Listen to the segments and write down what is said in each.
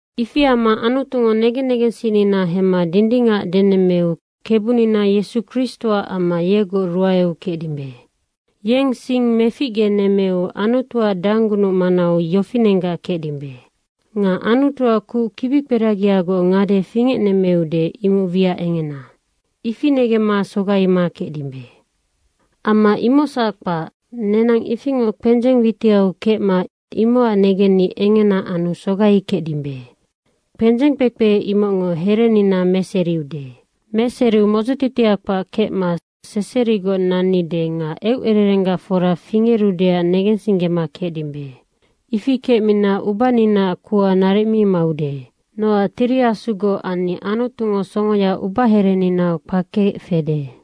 Ifi amma Anutungo negen negensinnina hemma dindingac denemmeu Kebunina Yesu Kristoac amma yegoc ruaeu kecdimbe. Yeng sing meficgenemmeu Anutuac danggunuc manau yofinenggac kecdimbe. Nga Anutuac kuc kibikperagiagoc ngade fingecnemmeude, imoc wiac engena, ifi negemma sogaima kecdimbe. Amma imocsac kpac, nenang ifingoc kpendzeng witiau kecma imocac negenni engena anu sogaikecdimbe. Kpendzeng kpekpe, imocngo herenina meseriude. Meseriu modzotitia kpac kecma seserigoc nannide nga eucererenggac fora fingerudeac negensinggema kecdimbe. Ifi kecmina ubaninaac kuha naric mi maude. Nocac Tiri Asugoc anni Anutungo songoya ubahereninau kpakeec fede.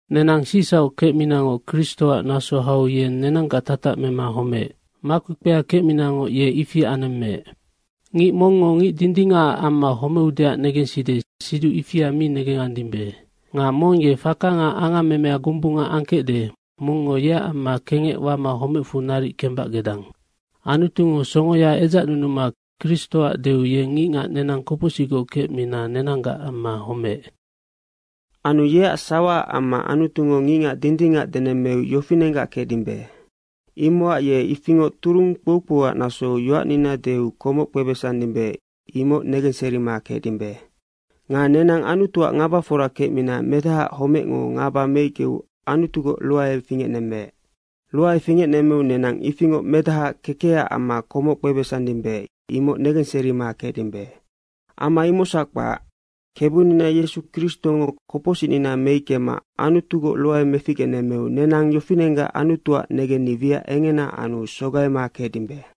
Nenang sicsauc kecminangoc Kristoac naso hau yeng nenanggac tatac mema homeec. Makpekpea kecminangoc, ye ifi anemmeec. Ngic mongngo ngic dindingacac amma homeudeac negenside, siduc ifia mi negengandimbe. Nga mong ye faka nga angammemea gombunga angkecde, mongngo yeac amma kengec wama homecfu naric kembac gedang. Anutungo songoya edzacnunuma Kristoac deu yeng ngicngac nenang kopocsicgoc kecmina nenanggac ammanoc homeec. Anu yeac sawaac amma Anutungo ngicngac dindingac denemmeu yofinenggac kecdimbe. Imocac ye ifingoc turung kpoukpouac nasou yoacnina deu komoc kpebesandimbe, imoc negenserima kecdimbe. Nga nenang Anutuac ngabafora kecmina Medahaac homecngo ngaba meickeu Anutugoc ruae fingecnemmeec. Ruae fingecnemmeu nenang ifingoc Medahaac kekecac amma komoc kpebesandimbe, imocnoc negenserima kecdimbe. Amma imocsac kpac, Kebunina Yesu Kristongo kopocsicnina meickema Anutugoc ruae meficgenemmeu nenang yofinenggac Anutuac negenni wiac engena anu sogaima kecdimbe.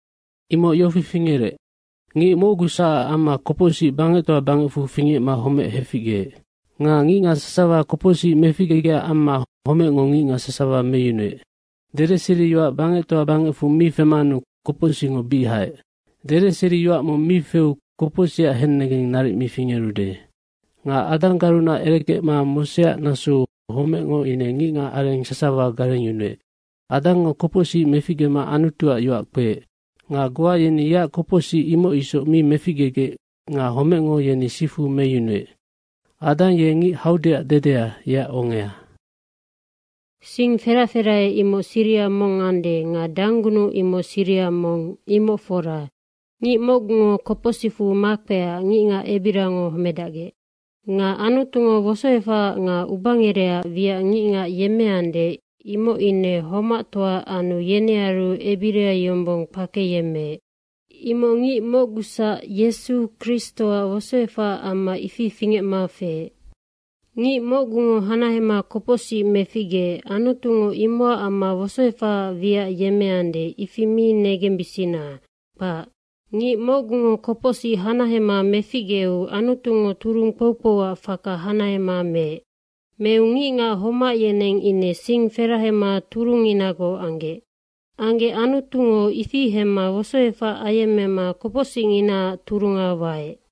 Imoc yofi fingerec, ngic mocguacsac amma kopocsic bangectoa bangecfu fingecma homec heficgeec. Nga ngicngac sasawa kopocsic meficgegecac amma homecngo ngicngac sasawa meyunuec. Dedeseriyoac bangectoa bangecfu mi femanu kopocsicngo bic haec. Dedeseriyoac mong mi feu kopocsicac hennegeng naric mi fingerude. Nga Adanggarunac erekecma Moseac nasou homecngo ine ngicngacareng sasawa garengyunuec. Adangngo kopocsic meficgema Anutuac yoac kpeec. Nga goa yeni yeac kopocsic imoc isoc mi meficgegec nga homecngo yeni sifu meyunuec. Adang ye ngic haudeac dedea, yeac ongea. Sing ferac ferahea, imoc siriha mong ande nga danggunuc imoc siriha mong, imoc fora. Ngic mocgungo kopocsicfu makpeecac ngicngac ebiriango homedacgec. Nga Anutungo wosoefahaac nga ubangerehaac wiac ngicngac yemmeande, imoc ine homactoa anu yenearu ebiria yombong kpakeyemmeec. Imoc ngic mocguacsac, Yesu Kristoac wosoefacac amma ifi fingecma feec. Ngic mocgungo hanahema kopocsic meficgeec, Anutungo imocac amma wosoefahaac wiac yemmeande, ifi mi negembisina, kpac. Ngic mocgungo kopocsic hanahema meficgeu Anutungo turung kpoukpouac faka hanahema meec. Meu ngicngac homac yeneng ine sing ferahema turungnginagoc anggec. Anggec Anutungo ifi hemma wosoefac ayemmema kopocsicnginaac turunga waec.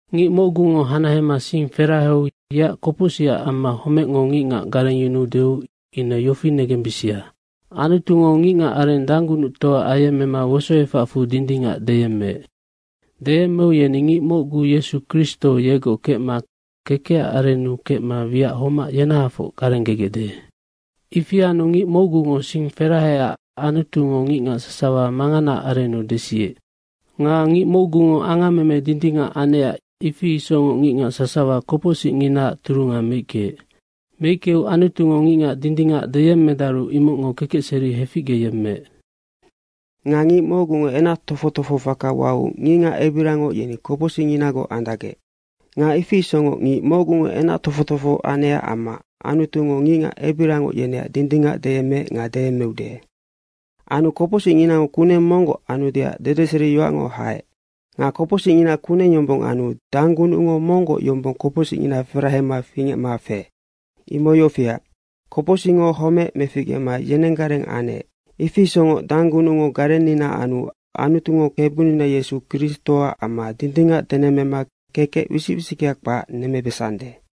Ngic mocgungo hanahema sing feraheu yeac kopocsicac amma homecngo ngicngac garengyunuudeu ine yofi negembisia, Anutungo ngicngacareng danggunuctoa ayemmema wosoefacfu dindingac deyemmeu, yeni ngic mocgu, Yesu Kristo, yegoc kecma kekecac arennu kecma wiac homac yenahafoc garenggegecde. Ifi anu ngic mocgungo sing feraheecac Anutungo ngicngac sasawa manganaac arennu desiec. Nga ngic mocgungo angammeme dindingac anecac ifi isocngoc ngicngac sasawa kopocsicnginaac turunga meickeec. Meickeu Anutungo ngicngac dindingac deyemmedaru imocngo kekecseri heficge yemmeec. Nga ngic mocgungo enac tofoc tofoho faka wau ngicngac ebiriangoc yeni kopocsicnginagoc andacgec. Nga ifi isocngoc ngic mocgungo enac tofoc tofoha anecac amma Anutungo ngicngac ebiriangoc yeneac dindingac deyemmeec nga deyemmeude. Anu kopocsicngina kuneng monggoc anudeac dedeseriyoac haec. Nga kopocsicngina kuneng yombong anu danggunucngo monggoc yombong kopocsicngina ferahema fingecma feec. Imoc yofiac, kopocsicngo homec meficgema yenenggareng anec, ifi isocngoc danggunucngo garennina anu Anutungo Kebunina Yesu Kristoac amma dindingac denemmema kekec wisic wisickea kpac nemmebesande.